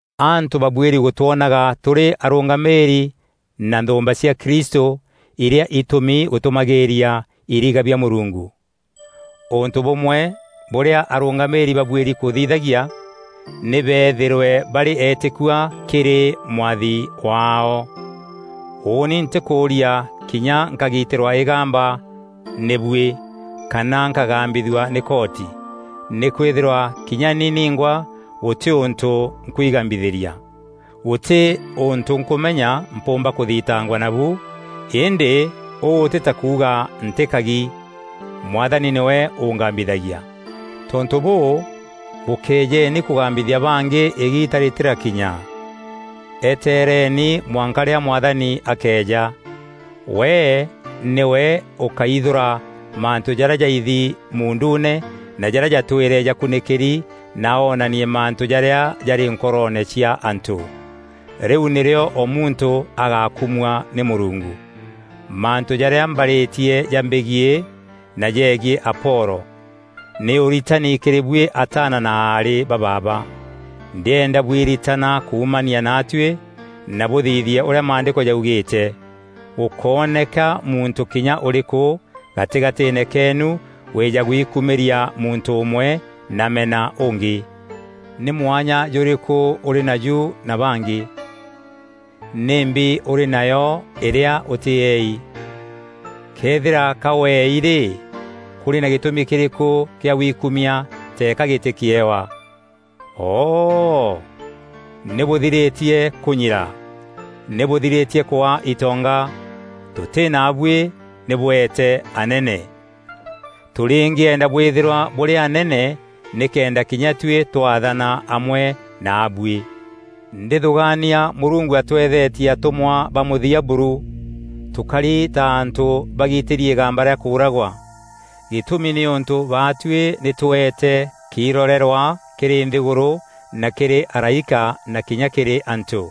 Antû babuîri gûtwonaga tûrî arûngamîîri na nthûûmba cia Kristû irîa itûmî gûtûmagîîria iriga bia Mûrungu. Ûntû bûmwe bûrîa arûngamîîri babuîri kûthithagia nî beethîrwe barî etîkua kîrî Mwathi waao. Ûûni ntîkûûria kinya nkagitîrwa îgamba nî buî kana nkagambithua nî koti. Nîkwîthîrwa kinya ni ningwa gûtî ûntû nkwigambithîria. Gûtî ûntû nkûmenya mpûûmba kûthitangwa nabu, îndî ûû tî ta kuuga ntî kagi. Mwathani nîwe ûngambithagia. Tontû bûû, bûkejeeni kûgambithia bangî îgiita rîtîrakinya. Eeteereni mwanka rîrîa Mwathani akeeja. We nîwe ûkaithûra mantû jarîa jaithi muunduune na jarîa jatwîre jakunîkîri na oonanie mantû jarîa jarî nkoroone cia antû. Rîu nîrîo o muntû agakumua nî Mûrungu. Mantû jarîa mbarîtie jambegiî na jegiî Apolo, nî ûritani kîrî buî ataana na aarî ba baaba. Ndîenda bwiritana kuumania natuî na bûthithie ûrîa Maandîko jaugîîte, “Gûkóneka muntû kinya ûrîkû gatîgatîîne keenu wîîja gwikumîria muntû ûmwe na amena ûngî.” Nî mwanya jûrîkû ûrî naju na bangî? Nîmbi ûrî nayo îrîa ûtîei? Këethîra ka weei rî, kûrî na gîtûmi kîrîkû kîa wikumia teeka gîtî kîewa? O-oo! Nî bûthirîtie kûnyira! Nî bûthirîtie kwaa itonga! Tûtî naabuî nî bweete anene! Tûrîngîenda bwîthîrwa bûrî anene nîkenda kinya tuî twathana amwe naabuî! Ndîthûgaania Mûrungu atweethetie atûmwa ba mûthia buru; tûkari ta antû bagitîri îgamba rîa kûûragwa. Gîtûmi nîûntû baatuî nî tweete kiirorerwa kîrî nthîgûrû na kîrî araîka na kinya kîrî antû.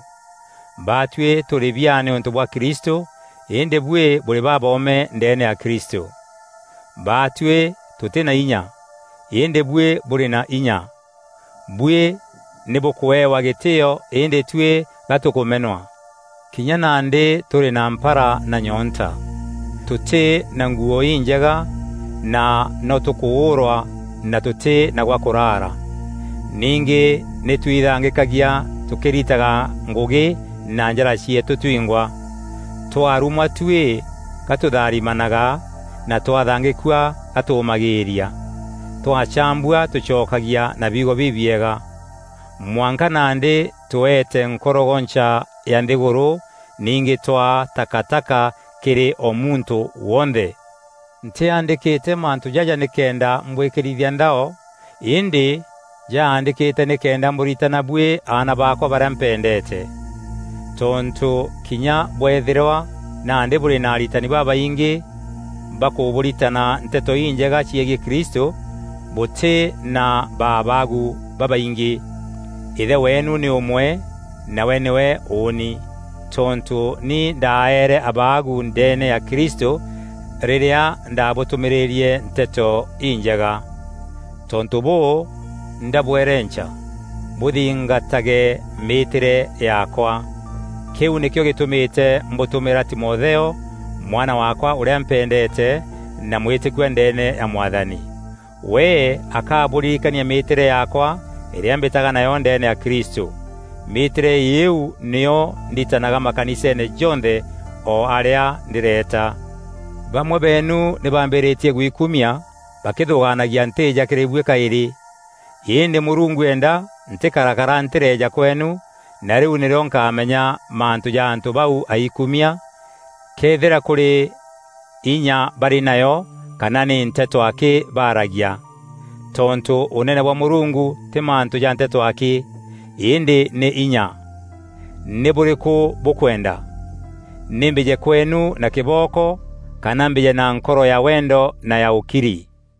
Baatuî tûrî biaa nîûntû bwa Kristû, îndî buî bûrî baboome ndeene ya Kristû! Baatuî tûtî na inya, îndî buî bûrî na inya. Buî nî bûkûewa gîtîîo îndî tuî ga tûkûmenwa. Kinya nandî tûrî na mpara na nyoonta; tûtî na nguû injega na no tûkûûrwa na tûtî na gwa kûrara. Ningî nî twithangîkagia tûkîritaga ngûgî na njara cieetû twingwa. Twarumwa tuî ga tûtharimanaga na twathangîkua ga tûmagîîria. Twacaambua tûcokagia na biugo bibiega. Mwanka nandî tweete nkorogoncha ya nthîgûrû, ningî twaa takataka kîrî o muntû wonthe! Ntîaandîkîte mantû jaja nîkenda mbwîkîrithia nthao îndî njaandîkîte nîkenda mbûritana buî aana baakwa barîa mpendeete. Tontû kinya bweethîrwa nandî bûrî na aritani babaingî bakûbûritana Nteto Injega ciegiî Kristû, bûtî na ba abagu babaingî. Îthe weenu nî ûmwe nawe nîwe ûûni. Tontû nî ndaeere abaagu ndeene ya Kristû rîrîa ndabûtûmîîrîrie Nteto Injega. Tontû bûû, ndabwerenca, bûthingatage mîîtîre yaakwa. Kîu nîkîo gîtûmîte mbûtûmîra Timotheo, mwana waakwa ûrîa mpendeete na mwîtîkua ndeene ya Mwathani. We akabûririkania mîîtîre yaakwa îrîa mbîtaga nayo ndeene ya Kristû. Mîîtîre îîu nîyo nditanaga makaniseene jonthe o arîa ndîreeta. Bamwe beenu nî baambîrîtie gwikumia bakîthûgaanagia ntîîja kîrî buî kaîrî. Îndî Mûrungu eenda ntîkarakara ntîreeja kweenu na rîu nîrîo nkaamenya mantû ja antû bau aikuumia, këethîra kûrî inya barî nayo kana nî nteto akî baaragia. Tontû Ûnene bwa Mûrungu tî mantû ja nteto akî, îndî nî inya. Nî bûrîkû bûkwenda? Nî mbîje kweenu na kîbooko, kana mbîje na nkoro ya wendo na ya ûkiri?